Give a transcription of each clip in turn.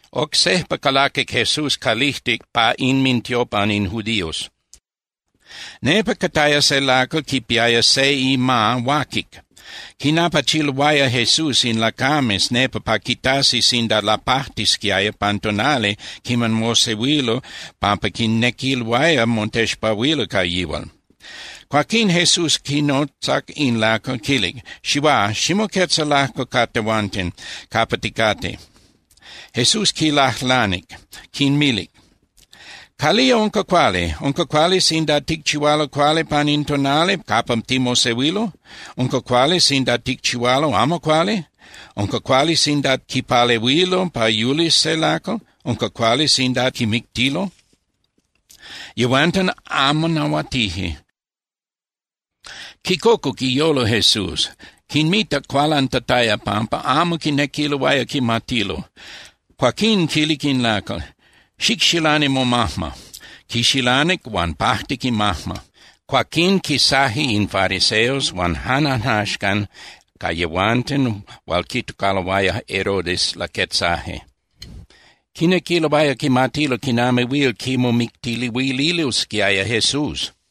Oc sejpa calaquic Jesús calijtic pa inmintiopan in judíos. Nepa cataya se lacal quipiaya se ima huaquic. Quinapachiloaya Jesús in lacames nepa pa quitasi sinda lapajtisquiaya pan tonali quiman mosehuilo pampa quinequiloaya motexpahuilo ca yihual. Cuaquín Jesús quinotzac in lacal, quilic: —Xihuá, ximoquetza lajco ca tehuanten capa ticate. Jesús quinlajlanic, quinmilic: —¿Calía unca cuali? ¿Unca cuali sinda ticchihualo cuali pan in tonali capa timosehuilo? ¿Unca cuali sinda ticchihualo amo cuali? ¿Unca cuali sinda quipalehuilo pa yulis se lacal? ¿Unca cuali sinda quimictilo? Yehuanten amo nahuatije. Quicocuc iyolo Jesús, quinmitac cualantataya pampa amo quinequiloaya quimatilo. Cuaquín quilic in lacal: —Xicxilani momajma. Quixilanic huan pajtic imajma. Cuaquín quisaje in fariseos huan jan ajnaxcan ca yehuanten hual quitocaloaya Herodes laquetzaje. Quinequiloaya quimatilo quinami huil quimomictiluililosquiaya Jesús.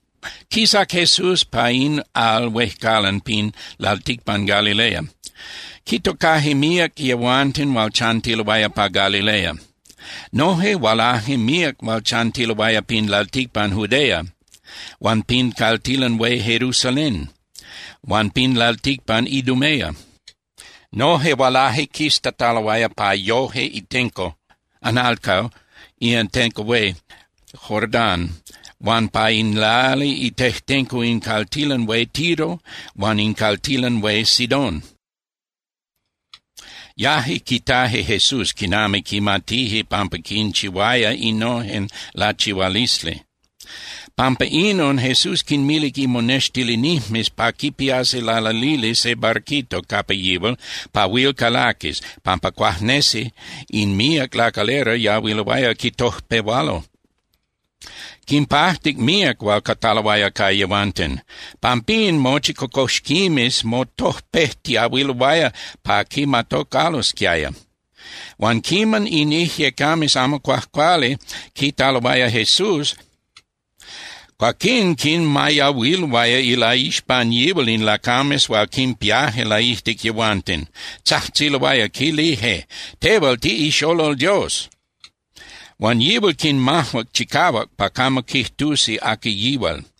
Quisac Jesús pa in al huejcalan pin lalticpan Galilea. Quitocaje míac yehuanten hual chantiloaya pa Galilea. Noje hualaje míac hual chantiloaya pin lalticpan Judea huan pin caltilan hué Jerusalén huan pin lalticpan Idumea. Noje hualaje quistataloaya pa yoje itenco (analco) in atenco hué Jordán huan pa in lali itejtenco in caltilan hué Tiro huan in caltilan hué Sidón. Yaje quitaje Jesús quiman quimatije pampa quinchihuaya innojen lachihualisli. Pampa inon Jesús quinmilic imonextilinijmes pa quipiasi lalalili se barquito capa yihual pa huil calaquis, pampa cuajnesi in míac lacalera yahuiloaya quitojpehualo. Quinpajtic míac hual cataloaya ca yehuanten. Pampín mochi cocoxquimes motojpejtiahuiloaya pa quimatocalosquiaya. Huan quiman in ijyecames amo cuajcuali quitaloaya Jesús, cuaquín quinmayahuiloaya ilaixpan yihual in lacames hual quinpiaje laijtic yehuanten, tzajtziloaya, quilije: —¡Tehual tiꞌixolol Dios! Huan yihual quinmajuac chicahuac pa camo quijtusi aqui yihual.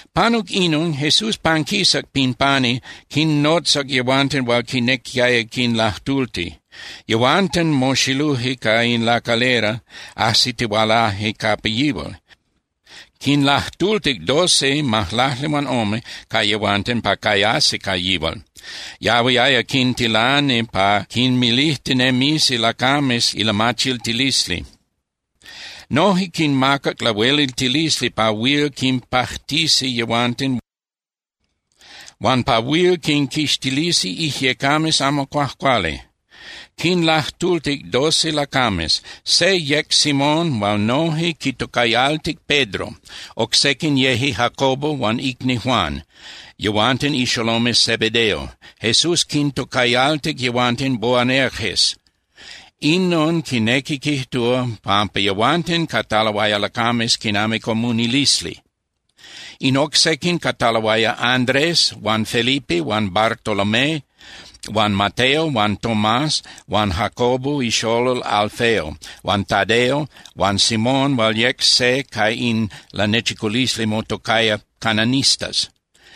Panuc inon, Jesús panquisac pin pani, quinnotzac yehuanten hual quinequiaya quinlajtulti. Yehuanten moxiluje ca in lacalera, ajsitihualaje capa yihual. Quinlajtultic doce (majlaclihuanome) ca yehuanten pa cayasi ca yihual. Yahuiaya quintilani pa quinmilijtinemisi lacames ilamachiltilisli. Noje quinmacac lahueliltilisli pa huil quinpajtisi yehuanten huan pa huil quinquixtilisi ijyecames amo cuajcuali. Quinlajtultic doce lacames. Se yec Simón hual noje quitocayaltic Pedro. Oc sequin yeje Jacobo huan icni Juan, yehuanten ixolomes Zebedeo. Jesús quintocayaltic yehuanten Boanerges. Inon quinequi quijtúa pampa yehuanten cataloaya lacames quinami comunilisli. In oc sequin cataloaya Andrés huan Felipe huan Bartolomé huan Mateo huan Tomás huan Jacobo ixolol Alfeo, huan Tadeo huan Simón hual yec se ca in lanechiculisli motocaya cananistas.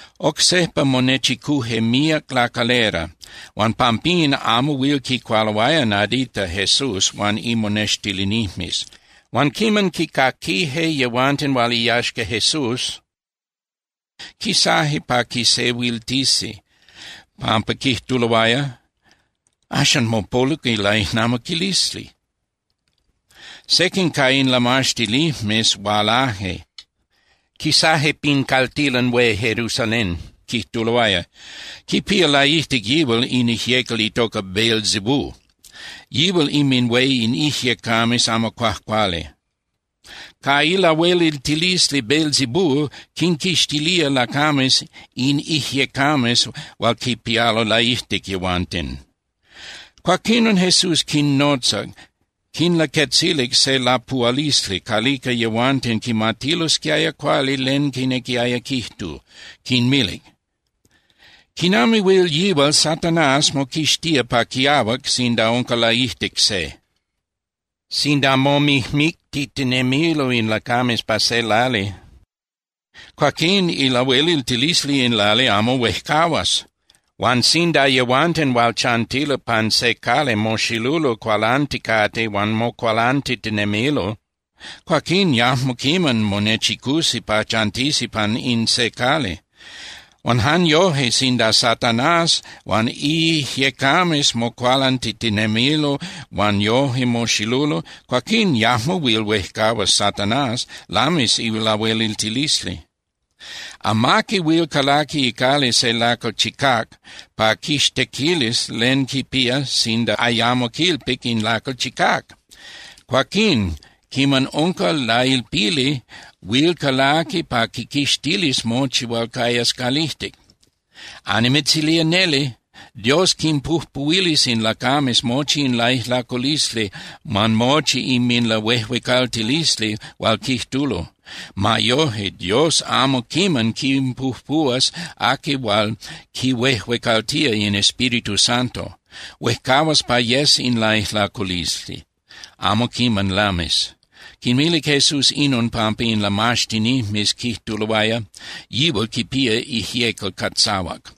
Oc sejpa monechicuje míac lacalera huan pampín amo huil quicualoaya nadita Jesús huan imonextilinijmes. Huan quiman quicaquije yehuanten hual iyaxca Jesús, quisaje pa quisehuiltisi, pampa quijtuloaya: —Axan mopoluc ilaijnamiquilisli. Sequin ca in lamaxtinijmes hualaje, quisaje pin caltilan hué Jerusalén, quijtuloaya: —Quipía laijtic yihual in ijyecal itoca Beelzebú. Yihual inminhué in ijyecames amo cuajcuali. Ca ilahueliltilisli Beelzebú quinquixtilía lacames in ijyecames hual quinpialo laijtic yehuanten. Cuaquinon Jesús quinnotzac, quinlaquetzilic se lapuhualisli calica yehuanten quimatilosquiaya cuali len quinequiaya quijtu, quinmilic: —¿Quinami huil yihual Satanás moquixtía pa quiahuac sinda unca laijtic se? Sinda momijmictitinemilo in lacames pa se lali, cuaquín ilahueliltilisli in lali amo huejcahuas. Huan sinda yehuanten hual chantilo pan se cali moxilulo cualanticate huan mocualantitinemilo, cuaquín yajmo quiman monechicusi pa chantisi pan in se cali. Huan jan yoje, sinda Satanás huan iijyecames mocualantitinemilo huan yoje moxilulo, cuaquín yajmo huil huejcahuas Satanás, lamis ilahueliltilisli. ’Amaqui huil calaqui icali se lacal chicác pa quixtequilis len quipía sinda ayamo quilpic in lacal chicác. Cuaquín, quiman unca lailpili, huil calaqui pa quiquixtilis mochi hual cayas calijtic. ’Annimitzilía neli, Dios quinpujpuhuilis in lacames mochi in laijlaculisli huan mochi inminlahuejuecaltilisli hual quijtulo. Ma yoje, Dios amo quiman quipujpuhuas aqui hual quihuejuecaltía in Espíritu Santo. Huejcahuas pa yes in laijlaculisli, amo quiman lamis. Quinmilic Jesús inon pampa in lamaxtinijmes quijtuloaya: —Yihual quipía ijyecal catzahuac.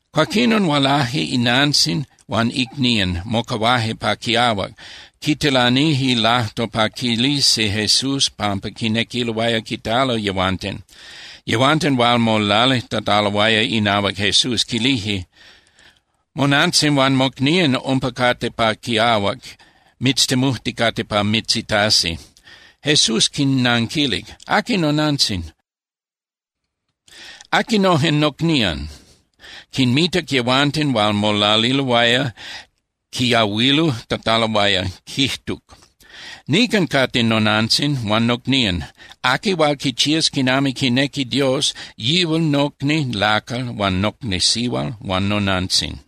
Cuaquinon hualaje inantzin huan icnían, mocahuaje pa quiahuac, quitilanije lajtol pa quilisi Jesús pampa quinequiloaya quitalo yehuanten. Yehuanten hual molalijtataloaya inahuac Jesús quilije: —Monantzin huan mocnían umpa cate pa quiahuac mitztemujticate pa mitzitasi. Jesús quinnanquilic: —¿Aqui nonantzin? ¿Aquinojen nocnían? Quinmitac yehuanten hual molaliloaya quiyahualujtataloaya, quijtuc: —Nican cate nonantzin huan nocnían. Aqui hual quichías quinami quinequi Dios, yihual nocni lacal huan nocni sihual huan nonantzin.